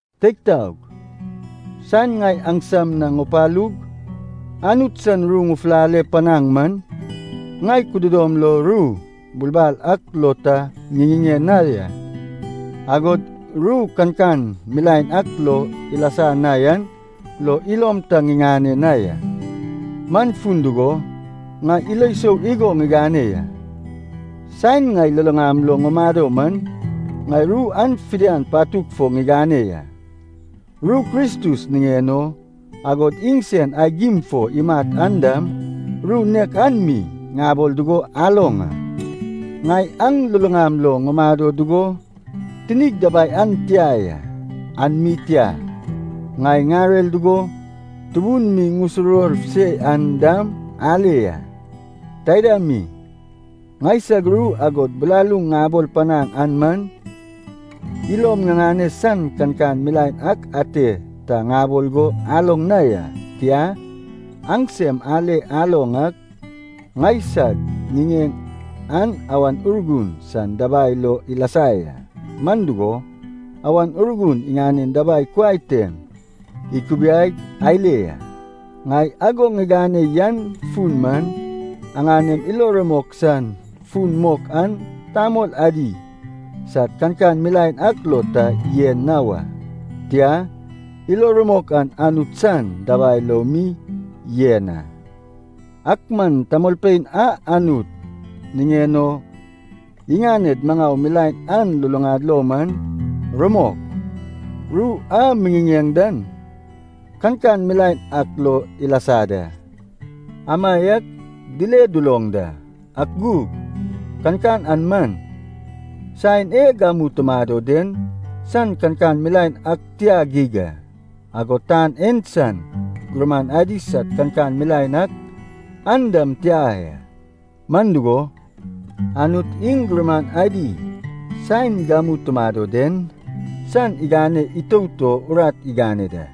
Teig taog, saen ŋai aŋsam na ŋupalug Anut san ru ŋufulale panaŋ man, ŋai kudodom lo ru bulbal ak lo ta ŋiŋiŋeŋ na ya, agod ru kankan milaen ak lo ilasa na yan lo ilom ta ŋiŋane na ya. Man fun dugo, ŋai ilo sou igo ŋigane ya, saen ŋai luluŋam lo ŋumado man, ŋai ru an fidian patug fo ŋigane ya. Ru Kristus niŋen o, agod iŋsen aigim fo imat an dam, ru nek an mi ŋabol dugo aloŋ a. Ŋai aŋ luluŋam lo ŋumado dugo tinig dabai an tia ya. An mi tia, ŋai ŋarer dugo tubun mi ŋusuruwor se yan dam ale ya. Taida mi, ŋaisag ru agod bilaluŋ ŋabol panaŋ an man, ilom ŋiŋane san kankan milaen ak ate ta ŋabol go aloŋ na ya. Tia, aŋsem ale aloŋ ak, ŋaisag ŋiŋeŋ an Awan Urgun san dabai lo ilasa ya, man dugo, Awan Urgun iŋanen dabai kuai tem ikubiaig ale ya. Ŋai ago ŋigane yan fun man, aŋanem ilo rumok san fun mok an tamol adi sad kankan milaen ak lo ta yen na wa. Tia, ilo rumok an Anut san dabai lo mi yen a. Ak man tamolpein a Anut niŋen o iŋaned maŋau milaen an luluŋad lo man, rumok, ru a miŋiŋeŋ dan kankan milaen ak lo ilasa da, amaiak dile duloŋ da. Ak gug kankan an man, saen e gamu tumado den san kankan milaen ak tia geig a, agod tan en san gurman adi sad kankan milaen ak, an dam tia ya. Man dugo, Anut iŋ gurman adi saen gamu tumado den san igane itout o urat igane da.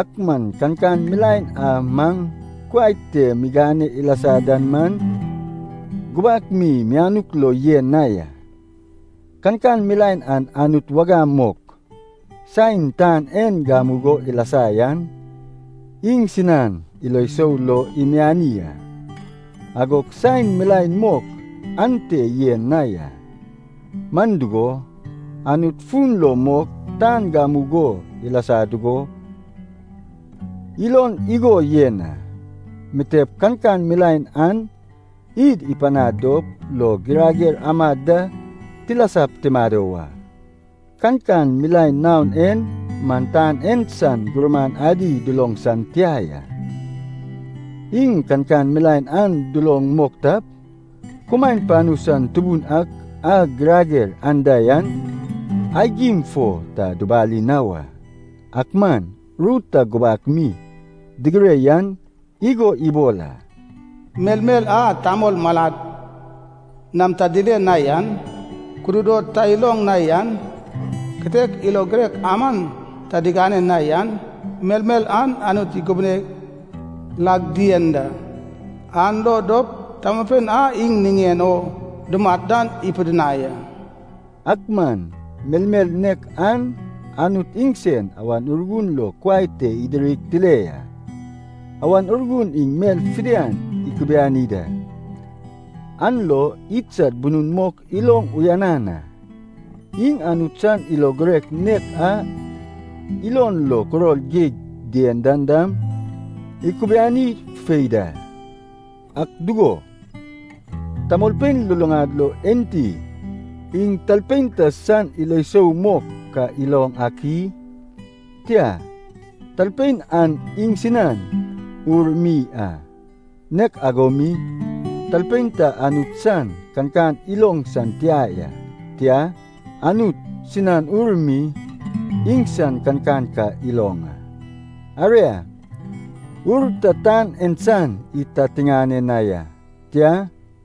Ak man kankan milaen a maŋ kuai te migane ilasa dan man, gubak mi mianuk lo yen na ya. Kankan milaen an Anut wagam mok, saen tan en gamugo ilasa yan, iŋsinan ilo sou lo imiani a, agog saen milaen mok ante yen na ya. Man dugo, Anut fun lo mok tan gamugo ilasa dugo ilon igo yen a, mitep kankan milaen an id ipanad dop lo girager amad da tilasap tumado wa. Kankan milaen naon en man tan en san gurman adi duloŋ san tia ya. Iŋ kankan milaen an duloŋ mok tap, kumaen panu san Tubun ak a girager anda yan, aigim fo ta dubali na wa. Ak man ru ta gubak mi digire yan igo ibol a, “Melmel a tamol malad nam ta dile na yan, kududod ta iloŋ na yan, kitek ilo girek aman ta digane na yan, melmel an Anut ikubune lag dien da, an lo dop tamolpein a iŋ niŋen o dumat dan ipidinai a.” Ak man melmel nek an Anut iŋsen Awan Urgun lo kuai te idirig tile ya. Awan Urgun iŋ mel fidian ikubiani da, an lo iŋsad bunun mok iloŋ uyanan a. Iŋ Anut san ilo girek nek a ilon lo kuror geig dien dan dam ikubiani fufei da. Ak dugo, tamolpein luluŋad lo enti iŋ talpein ta san ilo sou mok ka iloŋ ak i? Tia, talpein an iŋsinan ur mi a. Nek ago mi, talpein ta Anut san kankan iloŋ san tia ya, tia, Anut sinan Ur mi iŋsan kankan ka iloŋ a. Aria, ur ta tan en san id ta tiŋane na ya, tia,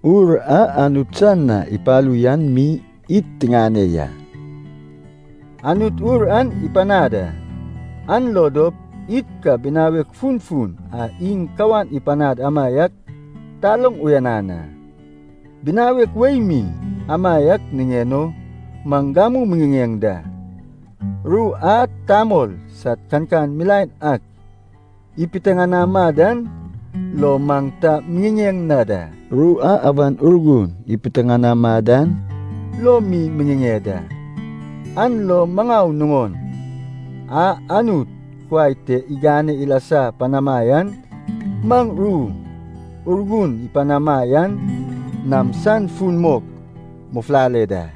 Ur a Anut san na ipalu yan mi id tiŋane ya. Anut Ur an ipanad a, an lo dop id ka binawek funfun a iŋ kawan ipanad amaiak taloŋ uyanan a. Binawek wei mi amaiak niŋen o maŋ gamu miŋiŋeŋ da. Ru a tamol sad kankan milaen ak ipiteŋanama dan lo maŋ ta miŋiŋeŋ na da. Tia, ru a Awan Urgun ipiteŋanama dan lo mi miŋiŋeŋ da. An lo maŋau nuŋon a Anut kuai te igane ilasa panama yan, maŋ ru Urgun ipanama yan nam san fun mok mufulale da.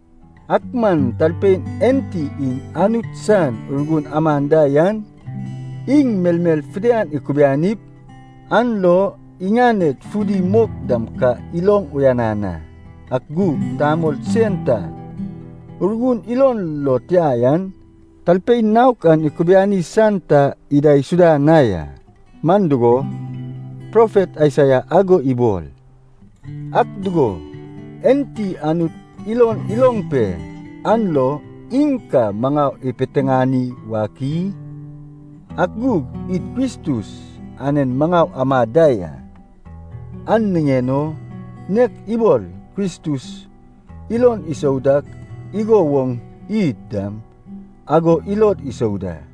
Ak man talpein enti iŋ Anut san Urgun aman da yan, iŋ melmel fidian ikubianip, an lo iŋaned fudi mok dam ka iloŋ uyanan a. Ak gug tamol sen ta Urgun ilon lo tia yan, talpein naok an ikubiani san ta idaisuda na ya. Man dugo, profet Aisaia ago ibol, “Ak dugo, enti Anut ilon iloŋ pe an lo iŋ ka maŋau ipiteŋani wak i?” Ak gug id Kristus anen maŋau amad da ya, an niŋen o nek ibol Kristus ilon isou dak igo woŋ id dam ago ilod isou da.